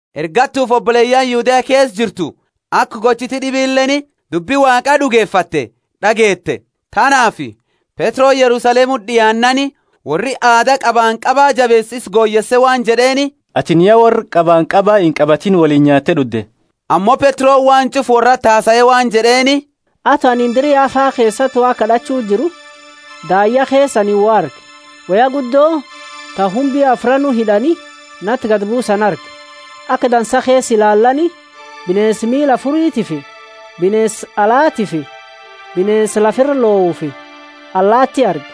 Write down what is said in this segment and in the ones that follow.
Ergattufi oboleyaani Yudea keesa jirtu, aka gochiti d'ibileeni dubbi Waaqa d'ugefatte d'ageete. Tanaafi Petroni Yerusalemuti d'iaannaani worri aada qabanqaba jabeesu isa goyeese waan jed'eeni, Atini ya worra qabanqaba inqabatini woliini nyaatte d'udde. Ammo Petroni waan ch'ufa worrati hasae waan jed'eeni. Ato anini dira Yafa keesati Waaqa kad'achu jiru, daayya keesa anini wo arge, woya guddo, ta humbi afraanu hid'ani nati gadi buusani arge. Aka dansa keesa ilaalani, bineensa miila afuritifi bineensa alatiifi bineensa lafa ira lohufi allaati arge.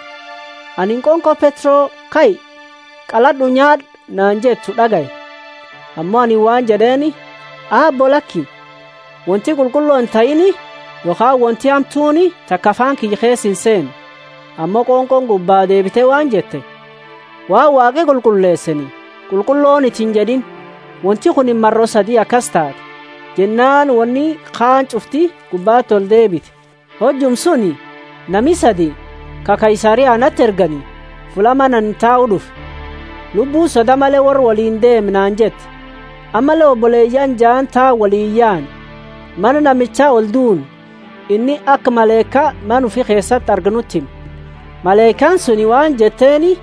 Anini qonqo, Petro, kai, qalad'u nyaad'u naani jettu d'agaye. Ammo anini waan jed'eeni, Aabbo laki, wonti qulqullo intahiini yokhaani wonti hamtuuni taka afaani kiyya keesa inseenne. Ammo qonqooni gubbaa deebite waan jette, Waan Waaqi qulqulleeseeni, Qulqulloniti injed'iini. Wonti kunini maro sadi akasi taate, jennaani wonini kaani ch'ufti gubbati oli deebite. Hojuma suni nami sadi, ka Kaisaria nati ergani, fulla mana anini tau d'ufe. Lubbuuni, Soda male worra woliini deemi naani jette. Ammalle oboleyaani jaani tanaani woliini yaane, mana namicha olduunne. Inni aka malaika mana ufi keesati arge nuti hime. Malaikaani suni waan jetteeni,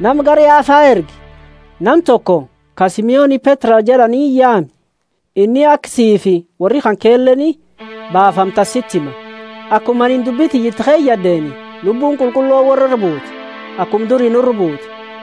Nama gara Yafa ergi, nama toko ka Simoni Petro jed'ani yaami; inni aka siifi worri kankeleeni baafamtani siti hima. Akuma anini dubbi tiyya iti keyad'eeni, Lubbuuni Qulqullooni worra ira buute, akuma duri nura buute.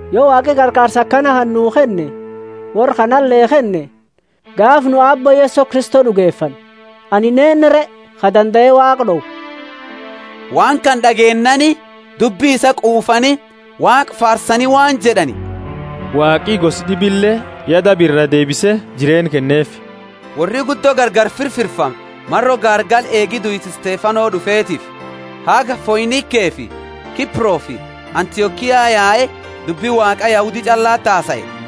Yo Waaqi qarqaarsa aka nuu kenne worra kanale kenne, gaafa nu Aabbo Yeso Kristo d'ugefanne, anini eennu re ka dandae Waaqa d'owu? Waan kana d'ageennaani dubbi isaa quufani, Waaqa faarsani waan jed'ani, Waaqi gosa d'ibile ya daba iraa deebise jireenna kenneefi. Worri guddo gargari firfirfame maro gaargala eegi duisa Stefano d'ufetiifi, haga Foinikefi Kiprofi Antiokia yae dubbi Waaqa Yahudi ch'allati hasae.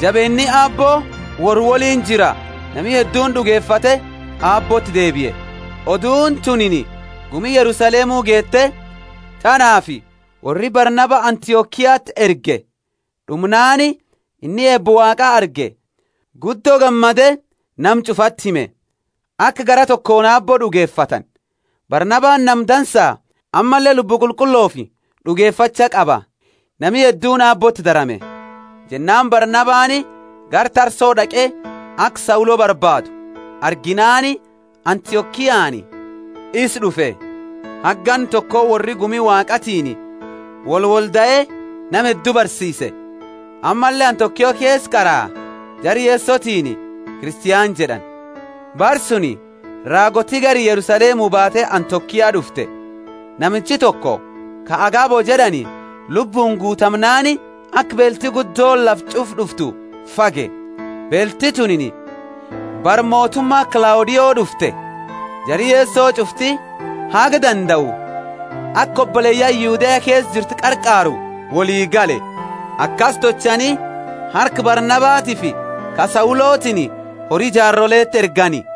Jabeenni Aabbo worra woliini jira, nami hedduuni d'ugefate Aabbooti deebie. Oduuni tunini gumi Yerusalemu geete, tanaafi worri Barnaba Antiokiati ergani. D'umnaani inni eeba Waaqa arge guddo gammade nama ch'ufati hime, aka garaa tokooni Aabbo d'ugefatani. Barnabani nama dansa, ammalle Lubbu Qulqullofi d'ugefacha qaba. Nami hedduuni Aabbooti darame. Jennaani Barnabani gara Tarso d'aqe aka Saulo barbaadu. Arginaani Antiokiani isa d'ufe. Haga ganna toko worri gumi Waaqatiini wolwoldae nama heddu barsiise. Ammalle Antiokia keesa qara jara Yesotiini Kristiani jed'ani. Bara suni raagooti gari Yerusalemu baate Antiokia d'ufte. Namichi toko, ka Agabo jed'ani, Lubbuuni guutamnaani, aka beelti guddooni lafa ch'ufa d'uftu fage. Beelti tunini bara motuma Klaudio d'ufte. Jari Yeso ch'ufti, haga dandau, aka oboleyaani Yudea keesa jirtu qarqaaru woli gale. Akasi tolchani, harka Barnabatiifi ka Saulotiini hori jaaroleti ergani.